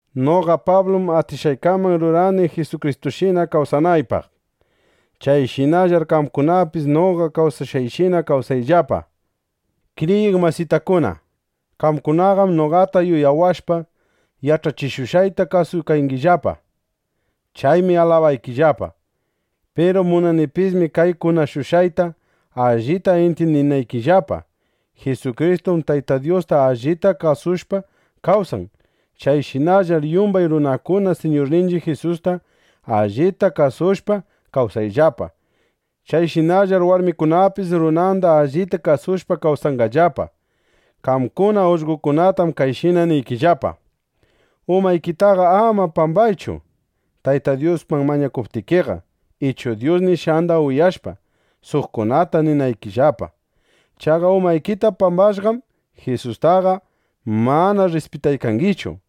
Noqa Pablum atishqaykaman rurani, Jisukristushina kawsanaypaq. Chayshinallar qamkunapis noqa kawsashqayshina kawsayllapa. Kriyiq masitakuna, qamkunaqam noqata yuyawashpa, yach'achishushqayta kasuykangillapa. Chaymi alabaykillapa. Piru munanipismi kay kunashushqayta allita intyindinaykillapa: Jisukristum Tayta Dyusta allita kasushpa kawsan. Chayshinallar yumbay runakuna Siñurninchiq Jisusta allita kasushpa kawsashunllapa. Chayshinallar warmikunapis runanda allita kasushpa kawsanqallapa. Qamkuna ullqokunatam kayshina niykillapa: Umaykitaqa ama pambaychu, Tayta Dyusman mañakunaykiqa ichu Dyus nishqanda uyashpa, suqkunata ninaykillapa. Chaqa umaykita pambashpaqam, Jisustaqa mana rrispitaykangichu.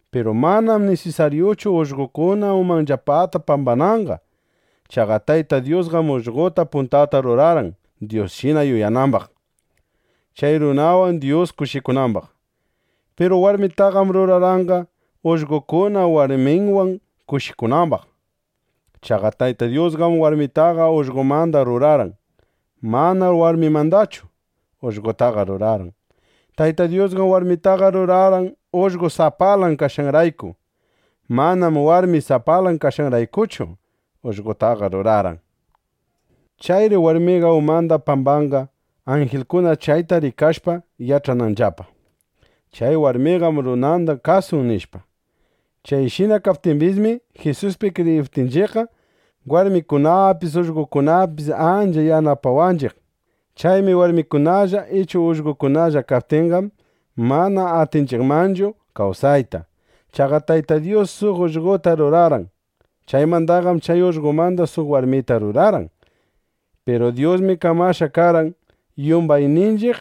Piru manam nisisaryuchu ullqokuna umanllapata pambananqa. Chaqa Tayta Dyusqam ullqota puntata rurarqan, Dyusshina yuyanambaq, chay runawan Dyus kushikunambaq. Piru warmitaqam rurarqanqa, ullqokuna warminwan kushikunambaq. Chaqa Tayta Dyusqam warmitaqa ullqomanda rurarqan. Manam warmimandachu ullqotaqa rurarqan. Tayta Dyusqam warmitaqa rurarqan, ullqo sapalan kashqanrayku. Manam warmi sapalan kashqanraykuchu, ullqotaqa rurarqan. Chayri warmiqa umanda pambanqa, anjilkuna chayta rikashpa, yach'ananllapa: Chay warmiqam runanda kasun, nishpa. Chayshina kaptimbismi, Jisuspi kriyiptinchiqqa, warmikunapis ullqokunapis ancha yanapanakunchiq. Chaymi warmikunalla ichu ullqokunalla kaptinqam, mana atinchiqmanchu kawsayta. Chaqa Tayta Dyus suq ullqota rurarqan. Chaymandaqam chay ullqomanda suq warmita rurarqan. Piru Dyusmi kamashqa karqan, yumbayninchiq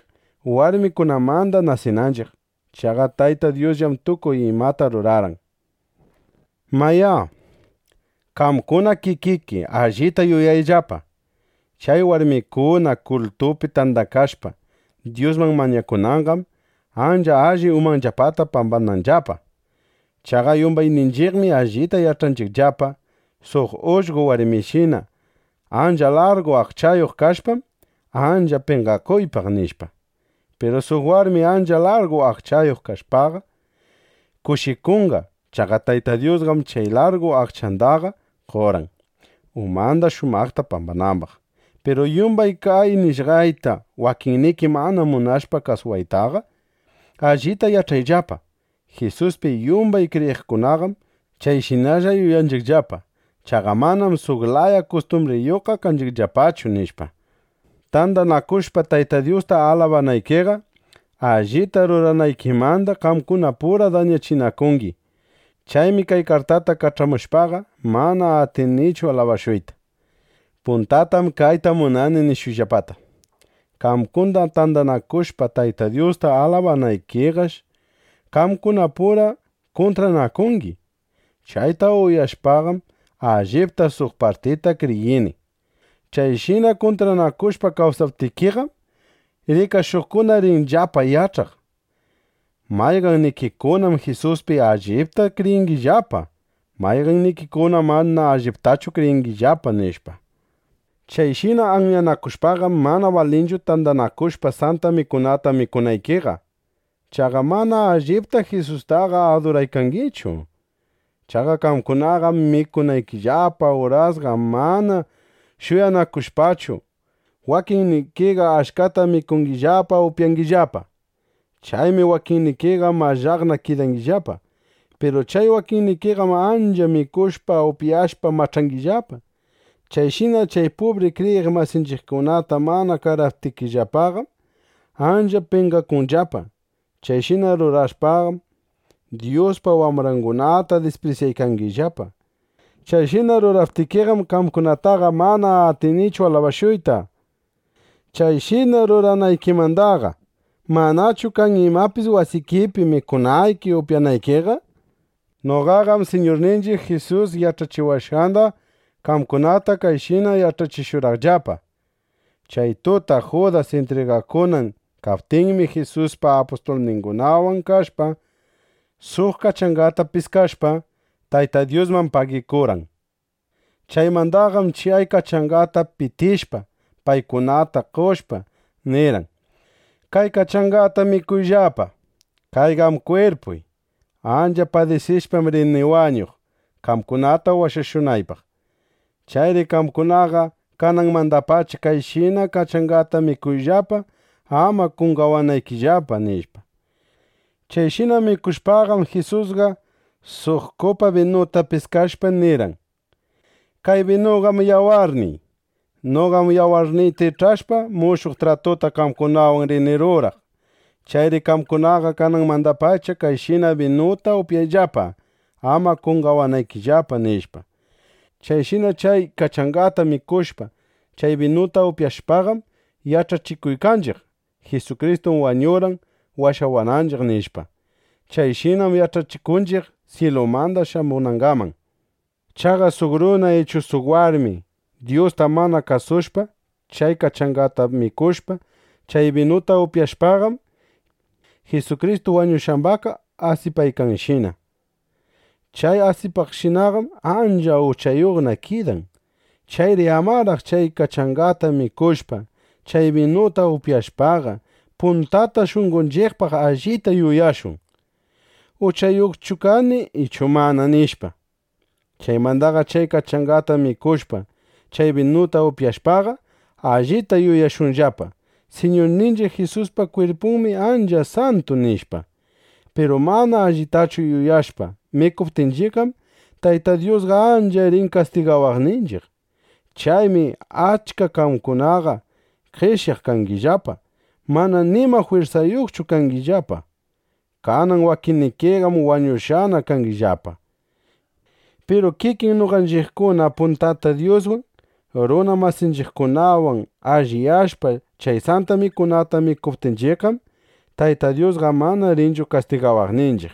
warmikunamanda nasinanchiq. Chaqa Tayta Dyusllam tukuy imata ruran. Mayá, qamkuna kikiki allita yuyayllapa: Chay warmikuna kultupi tandakashpa Dyusman mañakunanqam, ancha alli umanllapata pambananllapa. Chaqa yumbayninchiqmi allita yach'anchiqllapa: Suq ullqo warmishina ancha largu aqchayuq kashpam, ancha penqakuypaq, nishpa. Piru suq warmi ancha largu aqchayuq kashpaqa, kushikunqa. Chaqa Tayta Dyusqam chay largu aqchandaqa qorqan, umanda shumaqta pambanambaq. Piru yumbay kay nishqayta wakinniki mana munashpa kasuwaytaqa, allita yach'ayllapa: Jisuspi yumbay kriyiqkunaqam chayshinalla yuyanchiqllapa. Chaqa manam suq laya kustumbriyuqqa kanchiqllapachu, nishpa. Tandanakushpa Tayta Dyusta alabanaykiqa, allita ruranaykimanda qamkunapura dañachinakungi. Chaymi kay kartata kach'amushpaqa, mana atinichu alabashuyta. Puntatam kayta munani nishuyllapata: Qamkuna tandanakushpa Tayta Dyusta alabanaykiqash, qamkunapura kuntranakungi. Chayta uyashpaqam, allipta suq partita kriyini. Chayshina kuntranakushpa kawsaptikiqam, rikashuqkuna rinllapa yach'aq: Mayqannikikunam Jisuspi allipta kriyiykangillapa, mayqannikikunam mana alliptachu kriyingillapa, nishpa. Chayshina anyanakushpaqam, mana balinchu tandanakushpa Santa Mikunata mikunaykiqa. Chaqa mana alliptaqa Jisustaqa aduraykangichu. Chaqa qamkunaqam mikunaykillapa urasqa mana shuyanakushpachu, wakinnikiqa achkata mikungillapa, upyangillapa. Chaymi wakinnikiqa mallaqna kidangillapa. Piru chay wakinnikiqam ancha mikushpa, upyashpa mach'angillapa. Chayshina chay pubri kriyiq masinchiqkunata mana qaraptikillapaqam, ancha penqakunllapa. Chayshina rurashpaqam, Dyuspa wambrangunata disprisyaykangillapa. ¡Chayshina ruraptikiqam, qamkunataqa mana atinichu alabashuyta! Chayshina ruranaykimandaqa ¿manachu kan imapis wasikipi, mikunayki upyanaykiqa? Noqaqam Siñurninchiq Jisus yach'achiwashqanda qamkunata kayshina yach'achishurqaqllapa: Chay tuta Judas intrigakunan kaptinmi, Jisusqa apustulningunawan kashpa, suq kachangata piskashpa, Tayta Dyusman pagikurqan. Chaymandaqam, chay kachangata pitishpa, paykunata qoshpa, nirqan: “Kay kachangata mikuyllapa. Kayqam kwirpuy. Ancha padisishpam rini wañuq, qamkunata washashunaypaq. Chayri qamkunaqa kananmandapacha kayshina kachangata mikuyllapa, ama qonqawanaykillapa”, nishpa. Chayshina mikushpaqam, Jisusqa suq kupa binuta piskashpa nirqan: “Kay binuqam yawarniy. Noqam yawarniyta ich'ashpa, mushuq tratuta qamkunawan rini ruraq. Chayri qamkunaqa kanamandapacha kayshina binuta upyayllapa, ama qonqawanaykillapa”, nishpa. Chayshina chay kachangata mikushpa, chay binuta upyashpaqam, yach'achikuykanchiq: “Jisukristum wañurqan washawananchiq”, nishpa. Chayshinaqam yach'achikunchiq syilumanda shamunangaman. Chaqa suq runa ichu suq warmi Dyusta mana kasushpa, chay kachangata mikushpa, chay binuta upyashpaqam, Jisukristu wañushqambaqqa asipaykanshina. Chay asipaqshinaqam ancha uchayuqna kidan. Chayri amaraq chay kachangata mikushpa, chay binuta upyashpaqa, puntata shunqonchiqpaq allita yuyashun: ¿Uchayuqchu kani ichu mana? nishpa. Chaymanda chay kachangata mikushpa, chay binuta upyashpaqa, allita yuyashunllapa: Siñurninchiq Jisuspa kwirpunmi ancha santu, nishpa. Piru mana allitachu yuyashpa mikuptinchiqqam, Tayta Dyusqa ancha rin kastigawaqninchiq. Chaymi achka qamkunaqa qeshyaq kangillapa, mana nima jwirsayuqchu kangillapa. Kanan wakinnikiqam wañushqana kangillapa. Piru kikin noqanchiqkuna puntata Dyuswan, runa masinchiqkunawan alliyashpa, chay Santa Mikunata mikuptinchiqqam, Tayta Dyusqa mana rinchu kastigawaqninchiq.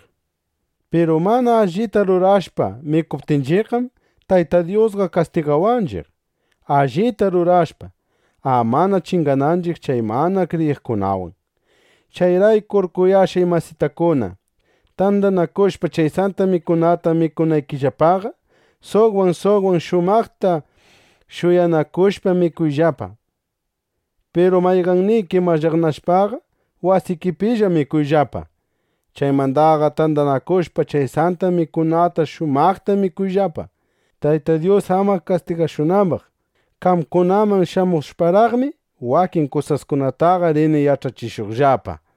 Piru mana allita rurashpa mikuptinchiqqam, Tayta Dyusqa kastigawanchiq, allita rurashpa, amana chingananchiq chay mana kriyiqkunawan. Chayraykur kuyashqay masitakuna, tandanakushpa chay Santa Mikunata mikunaykillapaqa, suqwan suqwan shumaqta shuyanakushpa mikuyllapa. Piru mayqanniki mallaqnashpaqa, wasikipilla mikuyllapa. Chaymandaqa tandanakushpa, chay Santa Mikunata shumaqta mikuyllapa, Tayta Dyus ama kastigashunambaq. Qamkunaman shamushparaqmi, wakin kusaskunataqa rini yach'achishuqllapa.